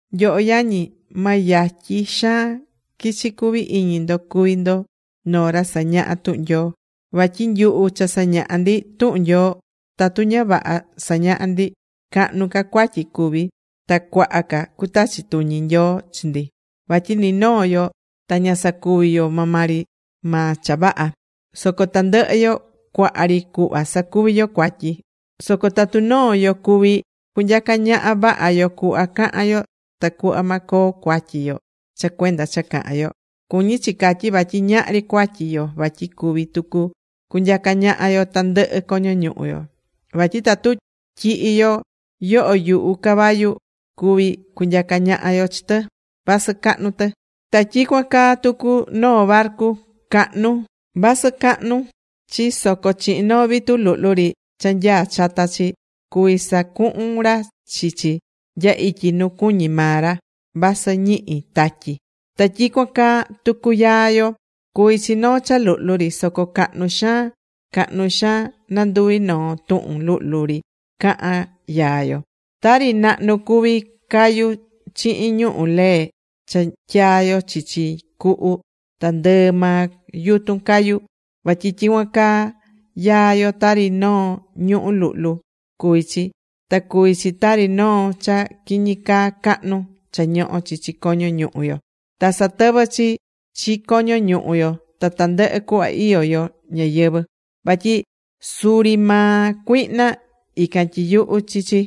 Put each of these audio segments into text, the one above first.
Nyoho yañi, ma yatyi xaan quichi cuvi iñi ndo cuvi ndo noo ra sañahá tuhun Nyoo. Vatyi nyuhu cha sañahá ndi tuhun Nyoo, tatu ña vaha sañahá ndi, cahnu ca cuatyi cuvi, ta cuaha ca cutachi tuñi Nyoo chi ndi. Vatyi ni noo yo ta ña sacuví yo maa maa ri maa cha vaha. Soco tandɨhɨ yo cuaha ri cuhva sacuví yo cuatyi. Soco tatu noo yo cuví cunyaca ñaha vaha yo cuhva cahan yo tacuhva ma coo cuatyi yo cha cuenda cha cahán yo, cuñí chi catyi vatyi ñahri cuatyi yo vatyi cuví tucu cunyaca ñaha yo tandɨhɨ coño ñuhu yo. Vatyi tatu tyihi yo yoho yuhu caballo cuví cunyaca ñaha yo chi tɨ, vasɨ cahnu tɨ. Ta tyicuan caa tucu noo barcu cahnu, vasɨ cahnu chi soco chihin noo vitu luhlu ri cha nyaá chata chi, cuví sacuhun ra chi chi nya ityi nu cuñí maa ra, vasɨ ñihi tatyi. Ta tyicuan caa tucu yaa yo. Cuví chi noo cha luhlu ri. Soco cahnu xaan cahnu xaan nanduvi noo tuhun luhlu ri cahan yaa yo. Tari nahnu cuvi cayu chihin ñuhu̱ lee cha tyaa yo chichi cuhu ta ndɨɨ maa yutun cayu. Vatyi tyicuan caa yaa yo tari noo ñuhu̱ luhlu cuví chi. Ta cuví chi tari noo cha quiñi caa cahnu cha ñohó chichi coño ñuhu yo, ta satɨvɨ́ chi chi coño ñuhu yo ta tandɨhɨ cuhva iyó yo ñayɨvɨ̱, vatyi suri maa cuihna, ican tyiyuhú chi chi.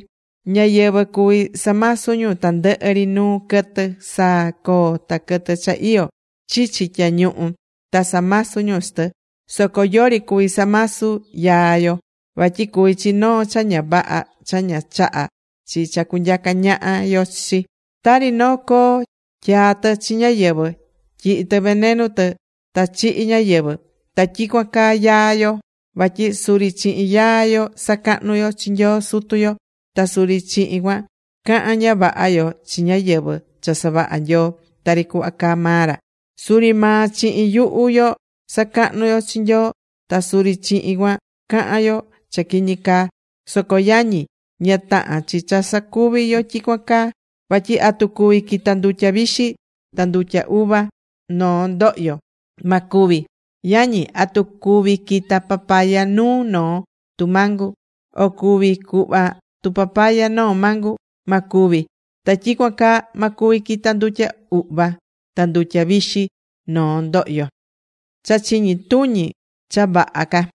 Ñáyɨvɨ cuví samasu ñu tandɨhɨ ri nuu quɨtɨ: saa, coo, ta quɨtɨ cha iyó chichi tyañuhu, ta samasú ñu chi tɨ. Soco yori cuví samasu yaa yo. Vatyi cuví chi noo cha ña vaha cha ña chahá chi cha cunyaca ñaha yo chi chi. Tari noo coo, tyaá tɨ chi ñáyɨvɨ, tyihi tɨ venenu tɨ ta chihi ñáyɨvɨ. Ta tyicuan caa yaa yo. Vatyi suri chihin yaa yo sacahnú yo chi Nyoo Sutu yo. Ta suri chihin cuan cahán ña vaha yo chi ñáyɨvɨ cha savaha̱ Nyoo tari cuhva caá maa ra. Suri maa chihin yuhu yo sacahnú yo chi Nyoo. Ta suri chihin cuan cahán yo cha quiñi caa. Soco yañi, ña tahán chi cha sacuví yo tyicuan caa. Vatyi, ¿atu cuví quita ndutya vixi ta ndutya uva noo ndohyo? Ma cuvi. Yañi, ¿atu cuví quita papaya nuu noo tumangu, o cuvi cuhva tupapaya noo mangu? Ma cuvi. Ta tyicuan caa ma cuvi quita ndutya uhva ta ndutya vixi noo ndohyo. Cha chiñi tuñi cha vaha ca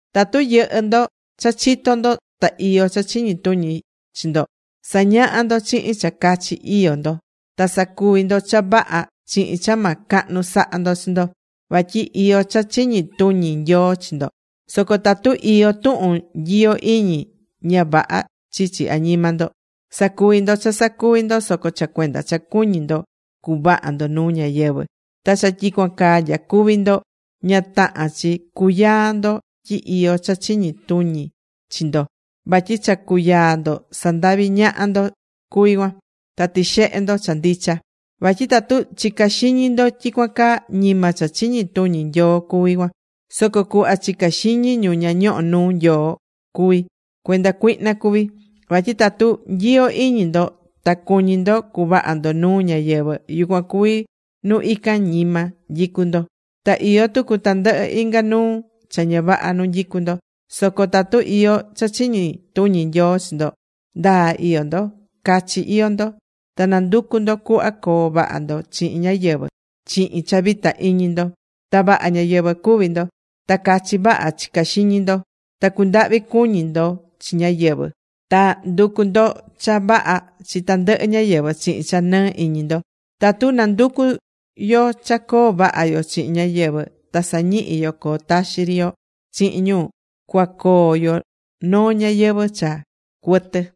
Tatu yɨhɨ́ ndo cha chitó ndo ta iyó cha chiñi tuñi chi ndo, sa̱ñaha ndo chihin cha cachi iyó ndo. Ta sa̱cuvi ndo cha vaha chihin cha ma cahnu saha ndo chi ndo, vatyi iyó cha chiñi tuñi Nyoo chi ndo. Soco tatu iyó tuhun nyiyo iñi ña vaha chichi añima ndo, sacuví ndo cha sacuvi ndo soco cha cuenda cha cuñí ndo cuvaha ndo nuu ñáyɨvɨ, ta cha tyicuan caa nyacuví ndo, ña tahán chi cuyaa ndo tyi iyó cha chiñi tuñi chi ndo, vatyi cha cuyaa ndo, sandaví ñaha ndo cuví cuan, ta tixehe ndo cha ndicha. Vatyi tatu chicá xiñi ndo tyicuan caa ñima cha chiñi tuñi Nyoo cuví cuan, soco cuhva chicá xiñi ñu ña ñohó nuu Nyoo cuví. Cuenda cuihna cuví. Vatyi tatu nyiyo iñi ndo ta cuñí ndo cuvaha ndo nuu ñáyɨvɨ, yucuan cuví nu ican ñima nyicú ndo. Ta iyó tucu tandɨhɨ inga nuu cha ña vaha nu nyicú ndo. Soco tatu iyó cha chiñi tuñi Nyoo chi ndo, ndaa iyó ndo, cachi iyó ndo. Ta nanducú ndo cuhva coo vaha ndo chihin ñáyɨvɨ chihin cha vita iñi ndo. Ta vaha ñáyɨvɨ cuví ndo. Ta cachi vaha chicá xiñi ndo. Ta cundahví cuñi ndo chi ñáyɨvɨ. Ta nducú ndo cha vaha chi tandɨhɨ ñáyɨvɨ chihin cha nɨɨ iñi ndo. Tatu nanducú yo cha coo vaha yo chihin ñáyɨvɨ, ta sañihi yo coo taxi ri yo chihin ñu, cuacoo yo noo ñayɨvɨ̱ cha cuɨtɨ.